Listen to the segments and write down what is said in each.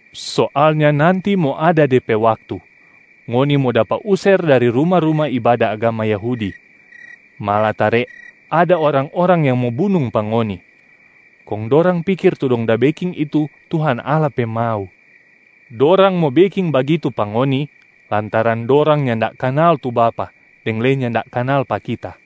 Soalnya nanti mo ada de pe waktu, ngoni mo dapa user dari ruma-ruma ibada agama Yahudi, malatare ada orang-orang yang mo bunung pa ngoni, kong dorang pikir tu dong da beking itu Tuhan Allah pe mau. Dorang mo beking bagitu pa ngoni, lantaran dorang nyanda kanal tu Bapa deng lei nyanda kanal pa Kita.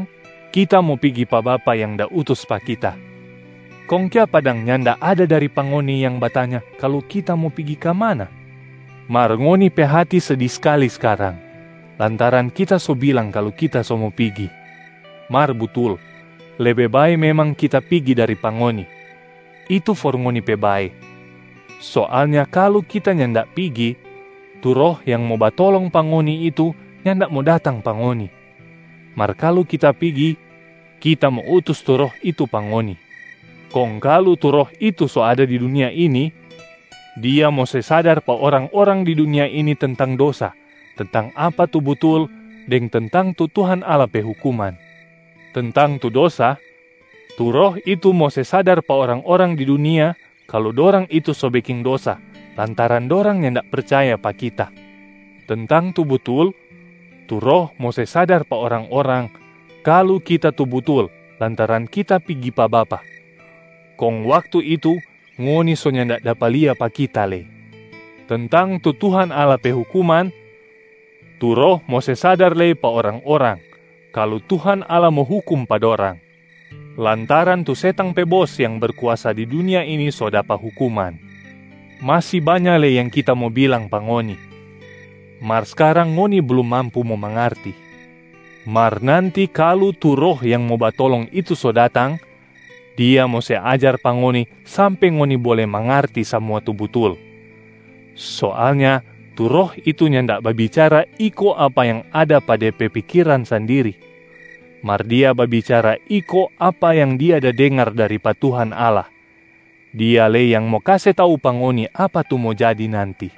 Skarang, Kita mo pigi pa Bapa yang da utus pa Kita. Kong kiapa dang nyanda ada dari pa ngoni yang batanya kalu Kita mo pigi ka mana? Mar ngoni pe hati sedi skali skarang lantaran Kita so bilang kalu Kita so mo pigi. Mar butul, lebe bae memang Kita pigi dari pa ngoni, itu for ngoni pe bae. Soalnya kalu Kita nyanda pigi, tu Roh yang mo batolong pa ngoni itu nyanda mo datang pa ngoni. Mar kalu Kita pigi, Kita mo utus tu Roh itu pa ngoni. Kong kalu tu Roh itu so ada di dunia ini, Dia mo se sadar pa orang-orang di dunia ini tentang dosa, tentang apa tu butul, deng tentang tu Tuhan Allah pe hukuman. Tentang tu dosa: tu Roh itu mo se sadar pa orang-orang di dunia kalu dorang itu so beking dosa lantaran dorang nyanda percaya pa Kita. Tentang tu butul: tu Roh mo se sadar pa orang-orang kalu Kita tu butul lantaran Kita pigi pa Bapa. Kong waktu itu ngoni so nyanda dapa lia pa Kita lei. Tentang tu Tuhan Allah pe hukuman: tu Roh mo se sadar lei pa orang-orang kalu Tuhan Allah mo hukum pa dorang, lantaran tu setang pe bos yang berkuasa di dunia ini so dapa hukuman. Masi banya lei yang Kita mo bilang pa ngoni, mar skarang ngoni blum mampu mo mangarti. Mar nanti kalu tu Roh yang mo batolong itu so datang, Dia mo se ajar pa ngoni sampe ngoni bole mangarti samua tu butul. Soalnya tu Roh itu nyanda babicara iko apa yang ada pa De pe pikiran sandiri, mar Dia babicara iko apa yang Dia da dengar dari pa Tuhan Allah. Dia lei yang mo kase tau pa ngoni apa tu mo jadi nanti.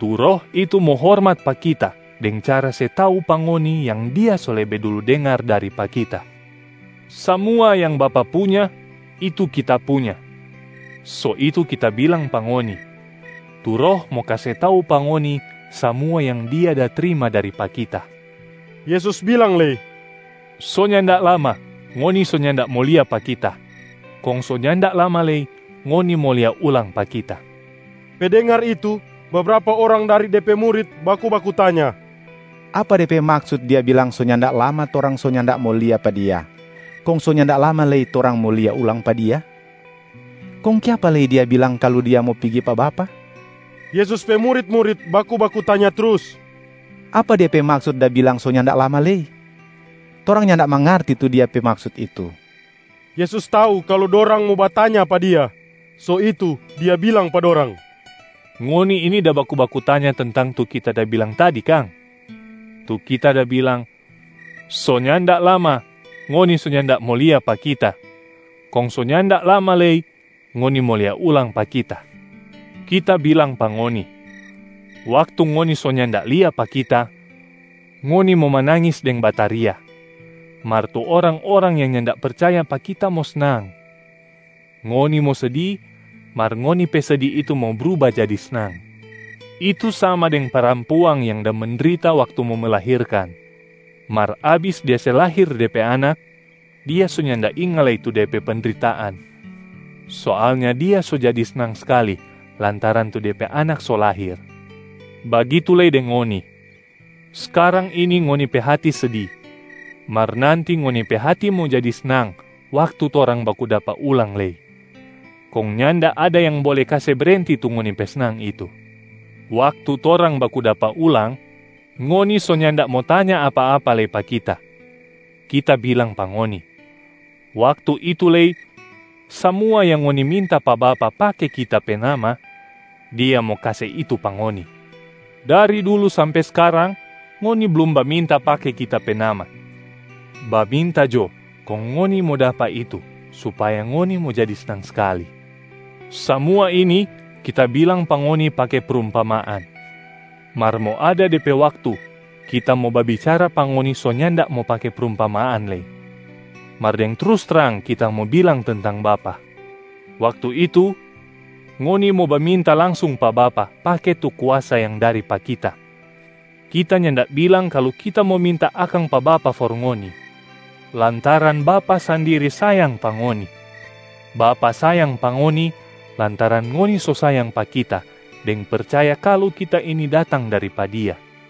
Tu Roh itu mo hormat pa Kita deng cara se tau pa ngoni yang Dia so lebe dulu dengar dari pa Kita. Samua yang Bapa punya, itu Kita punya. So itu Kita bilang pa ngoni, tu Roh mo kase tau pa ngoni samua yang Dia da trima dari pa Kita.” Yesus bilang lei, “So nyanda lama, ngoni so nyanda mo lia pa Kita. Kong so nyanda lama lei, ngoni mo lia ulang pa Kita.” Pe dengar itu, bebrapa orang dari De pe murit baku-baku tanya, “Apa de pe maksut Dia bilang so nyanda lama torang so nyanda mo lia pa Dia, kong so nyanda lama lei, torang mo lia ulang pa Dia? Kong kiapa lei Dia bilang kalu Dia mo pigi pa Bapa?” Yesus pe murit-murit baku-baku tanya trus, “Apa Dia pe maksut da bilang so nyanda lama lei? Torang nyanda mangarti tu Dia pe maksut itu.” Yesus tau kalu dorang mo batanya pa Dia. So itu, Dia bilang pa dorang, “Ngoni ini da baku-baku tanya tentang tu Kita da bilang tadi kang? Tu Kita da bilang, ‘So nyanda lama, ngoni so nyanda mo lia pa Kita. Kong so nyanda lama lei, ngoni mo lia ulang pa Kita.’ Kita bilang pa ngoni, waktu ngoni so nyanda lia pa Kita, ngoni mo manangis deng bataria, mar tu orang-orang yang nyanda percaya pa Kita mo snang. Ngoni mo sedi, mar ngoni pe sedi itu mo bruba jadi snang. Itu sama deng parampuang yang da mendrita waktu mo melahirkan, mar abis dia se lahir de pe anak, dia so nyanda inga lei tu de pe pendritaan. Soalnya dia so jadi snang skali lantaran tu de pe anak so lahir. Bagitu lei deng ngoni, skarang ini ngoni pe hati sedi, mar nanti ngoni pe hati mo jadi snang waktu torang baku dapa ulang lei, kong nyanda ada yang bole kase brenti tu ngoni pe snang itu. Waktu torang baku dapa ulang, ngoni so nyanda mo tanya apa-apa lei pa Kita. Kita bilang pa ngoni, waktu itu lei samua yang ngoni minta pa Bapa pake Kita pe nama, Dia mo kase itu pa ngoni. Dari dulu sampe skarang ngoni blum baminta pake Kita pe nama. Baminta jo kong ngoni mo dapa itu supaya ngoni mo jadi snang skali. Samua ini Kita bilang pa ngoni pake prumpamaan. Mar mo ada de pe waktu Kita mo babicara pa ngoni so nyanda mo pake prumpamaan lei, mar deng trus trang Kita mo bilang tentang Bapa. Waktu itu, ngoni mo baminta langsung pa Bapa pake tu kuasa yang dari pa Kita. Kita nyanda bilang kalu Kita mo minta akang pa Bapa for ngoni, lantaran Bapa sandiri sayang pa ngoni. Bapa sayang pa ngoni, lantaran ngoni so sayang pa Kita deng percaya kalu Kita ini datang dari pa Dia.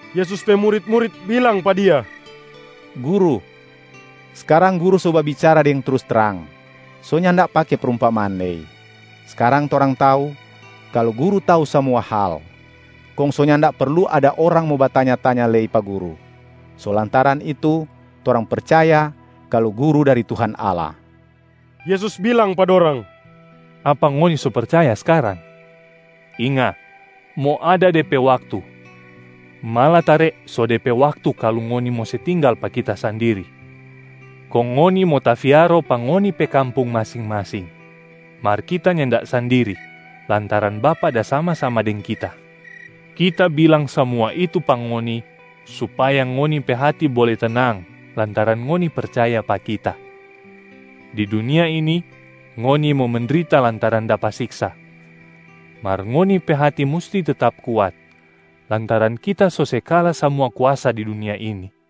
Yesus pe murit-murit bilang pa Dia, “Guru, skarang Guru so babicara deng trus trang, so nyanda pake prumpamaan lei. Skarang torang tau kalu Guru tau samua hal, kong so nyanda perlu ada orang mo batanya-tanya lei pa Guru. So lantaran itu torang percaya kalu Guru dari Tuhan Allah.” Yesus bilang pa dorang, “Apa ngoni so percaya skarang? Inga, mo ada de pe waktu, malatare so de pe waktu kalu ngoni mo se tinggal pa Kita sandiri, kong ngoni mo tafiaro pa ngoni pe kampung masing-masing. Mar Kita nyanda sandiri lantaran Bapa da sama-sama deng Kita. Kita bilang samua itu pa ngoni, supaya ngoni pe hati bole tenang lantaran ngoni percaya pa Kita. Di dunia ini ngoni mo mendrita lantaran dapa siksa, mar ngoni pe hati musti tetap kuat, lantaran Kita so se kala samua kuasa di dunia ini.”